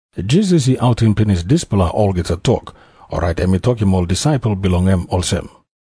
Jisas i autim pinis dispela olgeta tok, orait em i tokim ol disaipel bilong en olsem,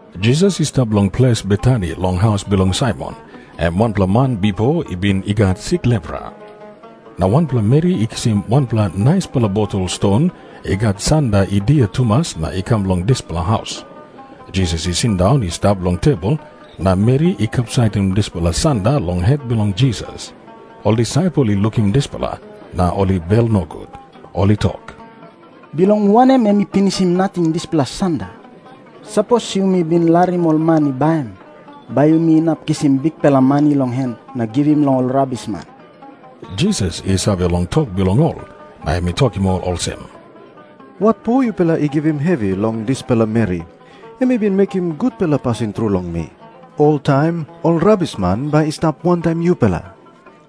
Jisas i stap long ples Betani long haus bilong Saimon, em wanpela man bipo i bin i gat sik lepra. Na wanpela meri i kisim wanpela naispela botol ston i gat sanda i dia tumas na i kam long dispela haus. Jisas i sindaun i stap long tebol na meri i kapsaitim dispela sanda long het bilong Jisas. Ol disaipel i lukim dispela, na ol i bel nogut. Ol i tok, “Bilong wanem em i pinisim nating dispela sanda? Sapos yumi bin larim ol man i baim, bai yumi inap kisim bikpela mani long en na givim long ol rabisman.” Jisas i save long tok bilong ol, na em i tokim ol olsem, “Watpo yupela i givim hevi long dispela meri? Em i bin mekim gutpela pasin tru long mi. Oltaim ol rabisman bai i stap wantaim yupela.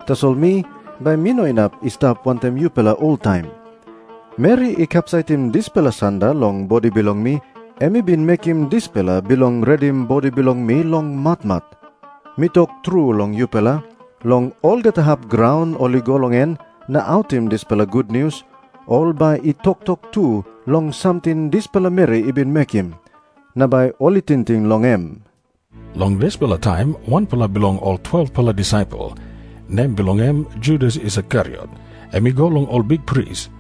Tasol mi, bai mi no inap i stap wantaim yupela oltaim. Meri i kapsaitim dispela sanda long bodi bilong mi, em i bin mekim dispela bilong redim bodi bilong mi long matmat. Mi tok tru long yupela, long olgeta hap graun ol i go long en na autim dispela gutnius, ol bai i toktok tu long samting dispela meri i bin mekim, na bai ol i tingting long em.” Long dispela taim wanpela bilong ol 12-pela disaipel, nem bilong en Judas Iskariot, em i go long ol bikpris.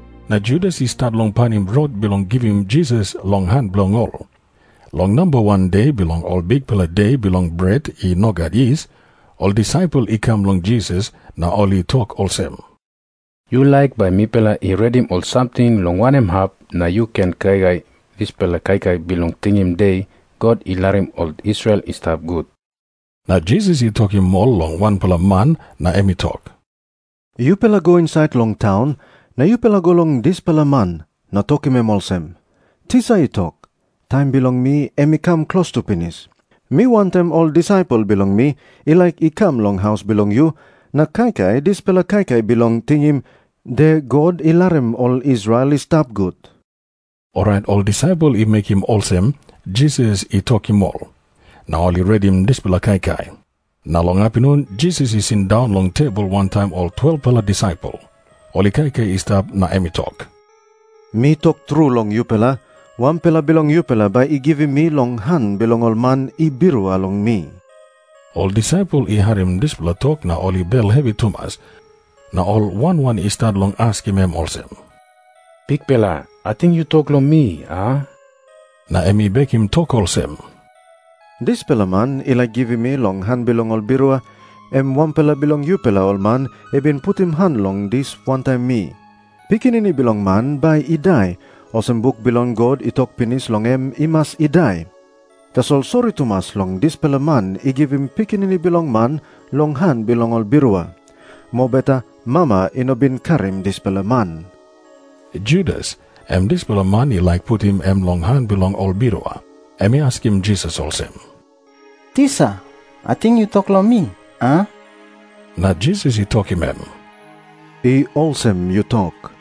Na Judas i stat long painim rot bilong givim Jisas long han bilong ol. Long namba wan de bilong Ol Bikpela De Bilong Bret I No Gat Yis, ol disaipel i kam long Jisas na ol i tok olsem, “Yu laik bai mipela i redim ol samting long wanem hap na yu ken kaikai dispela kaikai bilong tingim De God I Larim Ol Israel I Stap Gut?” Na Jisas i tokim ol long wanpela man na em i tok, “Yupela go insait long taun na yupela go long dispela man na tokim em olsem, ‘Tisa i tok, taim bilong mi em i kam klostu pinis. Mi wantaim ol disaipel bilong mi i laik i kam long haus bilong yu na kaikai dispela kaikai bilong tingim De God I Larim Ol Israel I Stap Gut.’” Orait ol disaipel i mekim olsem Jisas i tokim ol, na ol i redim dispela kaikai. Na long apinun Jisas i sindaun long tebol wantaim ol 12-pela disaipel. Ol i kaikai i stap, na em i tok, “Mi tok tru long yupela, wanpela bilong yupela bai i givim mi long han bilong ol man i birua long mi.” Ol disaipel i harim dispela tok na ol i bel hevi tumas, na ol wan wan i stat long askim em olsem, “Bikpela, ating yu tok long mi, a?” Na em i bekim tok olsem, “Dispela man i laik givim mi long han bilong ol birua, em wanpela bilong yupela ol man i bin putim han long dis wantaim mi. Pikinini Bilong Man bai i dai, olsem buk bilong God i tok pinis long em i mas i dai. Tasol sori tumas long dispela man i givim Pikinini Bilong Man long han bilong ol birua. Mobeta mama i no bin karim dispela man.” Judas, em dispela man i laik putim em long han bilong ol birua, em i askim Jisas olsem, “Tisa, ating yu tok long mi, a?” Na Jisas i tokim em, “I olsem yu tok.”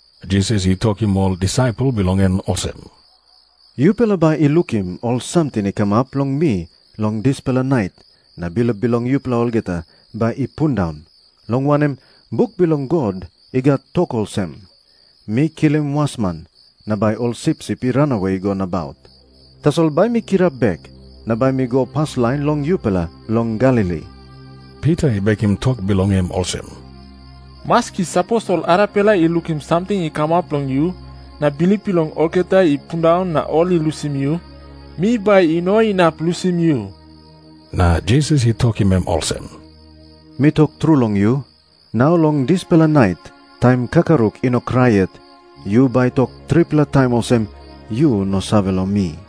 Jisas i tokim ol disaipel bilong en olsem, “Yupela bai i lukim ol samting i kamap long mi long dispela nait na bilip bilong yupela olgeta bai i pundaun, long wanem, buk bilong God i gat tok olsem, ‘Mi kilim wasman, na bai ol sipsip i ranawe i go nabaut.’ Tasol bai mi kirap bek, na bai mi go paslain long yupela long Galili.” Pita i bekim tok bilong en olsem, “Maski sapos ol arapela i lukim samting i kamap long yu na bilip bilong olgeta i pundaun na ol i lusim yu, mi bai i no inap lusim yu.” Na Jisas i tokim em olsem, “Mi tok tru long yu, nau long dispela nait, taim kakaruk i no krai yet, yu bai tok tripela taim olsem yu no save long mi.”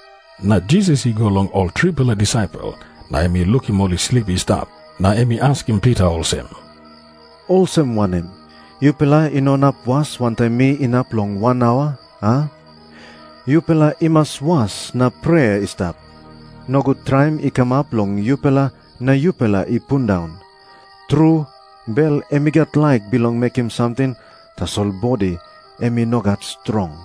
Na Jisas i go long ol tripela disaipel, na em i lukim ol i slip i stap. Na em i askim Pita olsem, “Olsem wanem? Yupela i no inap was wantaim mi inap long wan aua, a? Yupela i mas was na prea i stap. Nogut traim i kamap long yupela na yupela i pundaun. Tru, bel em i gat laik bilong mekim samting, tasol bodi em i no gat strong.”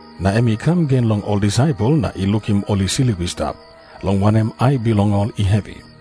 Na em i kam gen long ol disaipel na i lukim ol i slip i stap, long wanem, ai bilong ol i hevi.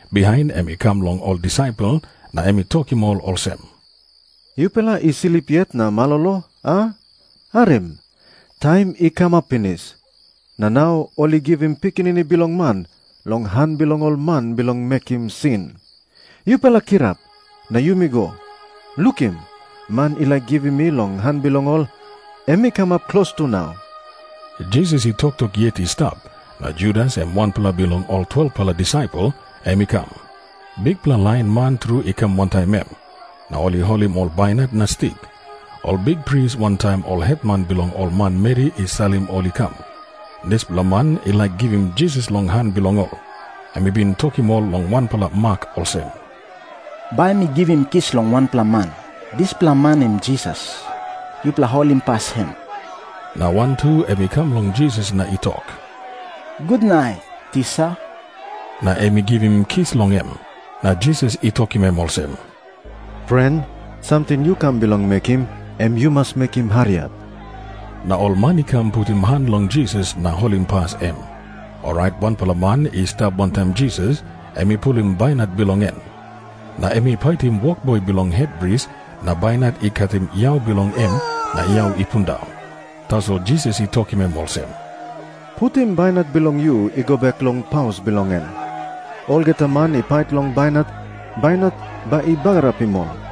Bihain em i kam long ol disaipel na em i tokim ol olsem, “Yupela i slip yet na malolo, a? Harim. Taim i kamap pinis, na nau ol i givim Pikinini Bilong Man long han bilong ol man bilong mekim sin. Yupela kirap, na yumi go. Lukim, man i laik givim mi long han bilong ol, em i kamap klostu nau.” Jisas i toktok yet i stap, na Judas, em wanpela bilong ol 12-pela disaipel, em i kam. Bikpela lain man tru i kam wantaim em, na ol i holim ol bainat na stik. Ol bikpris wantaim ol hetman bilong ol manmeri i salim ol i kam. Dispela man i laik givim Jisas long han bilong ol, em i bin tokim ol long wanpela mak olsem, “Bai mi givim kis long wanpela man. Dispela man em Jisas. Yupela holimpas em.” Na wantu em i kam long Jisas na i tok, “Gutnait, Tisa.” Na em i givim kis long em. Na Jisas i tokim em olsem, “Pren, samting yu kam bilong mekim, em yu mas mekim hariap.” Na ol man i kam na putim han long Jisas na holimpas em. Orait wanpela man i stap wantaim Jisas, em i pulim bainat bilong en. Na em i paitim wokboi bilong hetpris na bainat i katim yau bilong en na yau i pundaun. Tasol Jisas i tokim em olsem, “Putim bainat bilong yu i go bek long paus bilong en. Olgeta man i pait long bainat, bainat bai i bagarapim ol.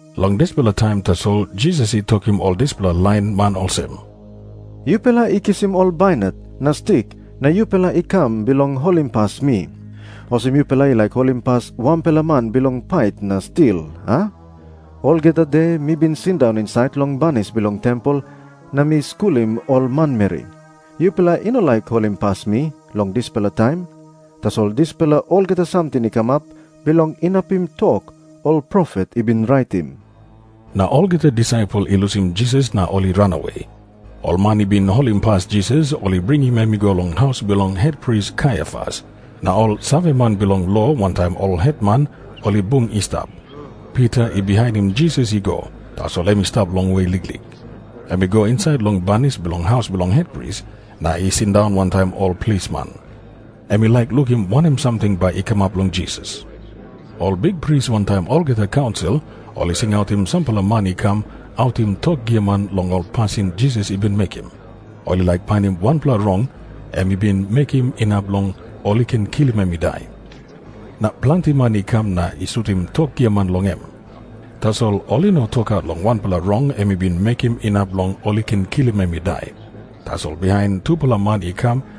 Long dispela taim tasol Jisas i tokim ol dispela lain man olsem, “Yupela i kisim ol bainat na stik na yupela i kam bilong holimpas mi, olsem yupela i laik holimpas wanpela man bilong pait na stil, a? Olgeta de mi bin sindaun insait long banis bilong tempel na mi skulim ol manmeri. Yupela i no laik holimpas mi long dispela taim? Tasol dispela olgeta samting i kamap bilong inapim tok ol profet i bin raitim.” Na olgeta disaipel i lusim Jisas na ol i ranawe. Ol man i bin holimpas Jisas ol i bringim em i go long haus bilong hetpris Kaiafas. Na ol saveman bilong lo wantaim ol hetman ol i bung i stap. Pita i bihainim Jisas i go, tasol em i stap longwe liklik. Em i go insait long banis bilong haus bilong hetpris, na i sindaun wantaim ol plisman. Em i laik lukim wanem samting bai i kamap long Jisas. Ol bikpris wantaim olgeta kaunsil ol i singautim sampela man i kam autim tok giaman long ol pasin Jisas i bin mekim. Ol i laik painim wanpela rong em i bin mekim inap long ol i ken kilim em i dai. Na planti man i kam na i sutim tok giaman long em. Tasol ol i no tokaut long wanpela rong em i bin mekim inap long ol i ken kilim em i dai. Tasol bihain tupela man i kam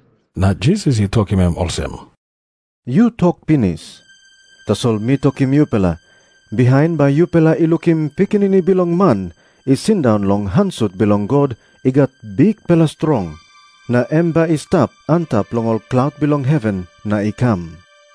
Na Jisas i tokim em olsem, “Yu tok pinis. Tasol mi tokim yupela, bihain bai yupela i lukim Pikinini Bilong Man i sindaun long han sut bilong God i gat bikpela strong. Na em bai i stap antap long ol klaut bilong heven na i kam.”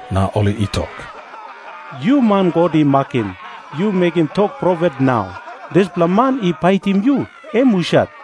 na ol i tok, “Yu man God i makim, yu mekim tok profet nau. Dispela man i paitim yu, em husat?”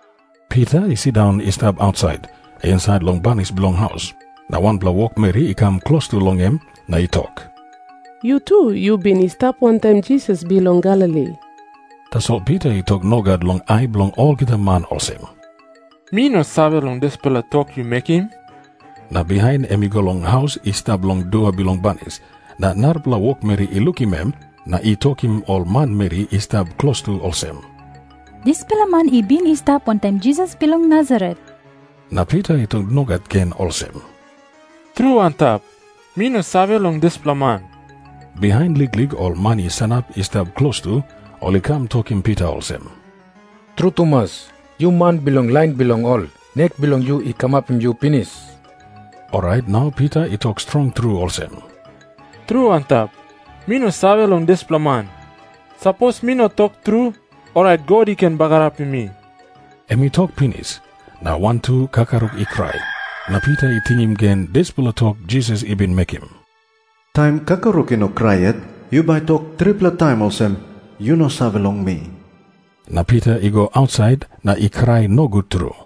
Pita i sindaun i stap ausait, insait long banis bilong haus. Na wanpela wokmeri i kam klostu long em na i tok, “Yu tu yu bin i stap wantaim Jisas bilong Galili.” Tasol Pita i tok nogat long ai bilong olgeta man olsem, “Mi no save long dispela tok yu mekim.” Na bihain em i go long haus i stap long dua bilong banis, na narapela wokmeri i lukim em na i tokim ol manmeri i stap klostu olsem, “Dispela man i bin i stap wantaim Jisas bilong Nasaret.” Na Pita i tok nogat gen olsem, “Tru antap, mi no save long dispela man.” Bihain liklik ol man i sanap i stap klostu, ol i kam tokim Pita olsem, “Tru tumas, yu man bilong lain bilong ol. Nek bilong yu i kamapim yu pinis.” Orait nau Pita i tok strong tru olsem, “Tru antap, mi no save long dispela man. Sapos mi no tok tru, orait God i ken bagarapim mi.” Em i tok pinis, na wantu kakaruk i krai. Na Pita i tingim gen dispela tok Jisas i bin mekim, “Taim kakaruk i no krai yet, yu bai tok tripela taim olsem yu no save long mi.” Na Pita i go ausait na i krai nogut tru.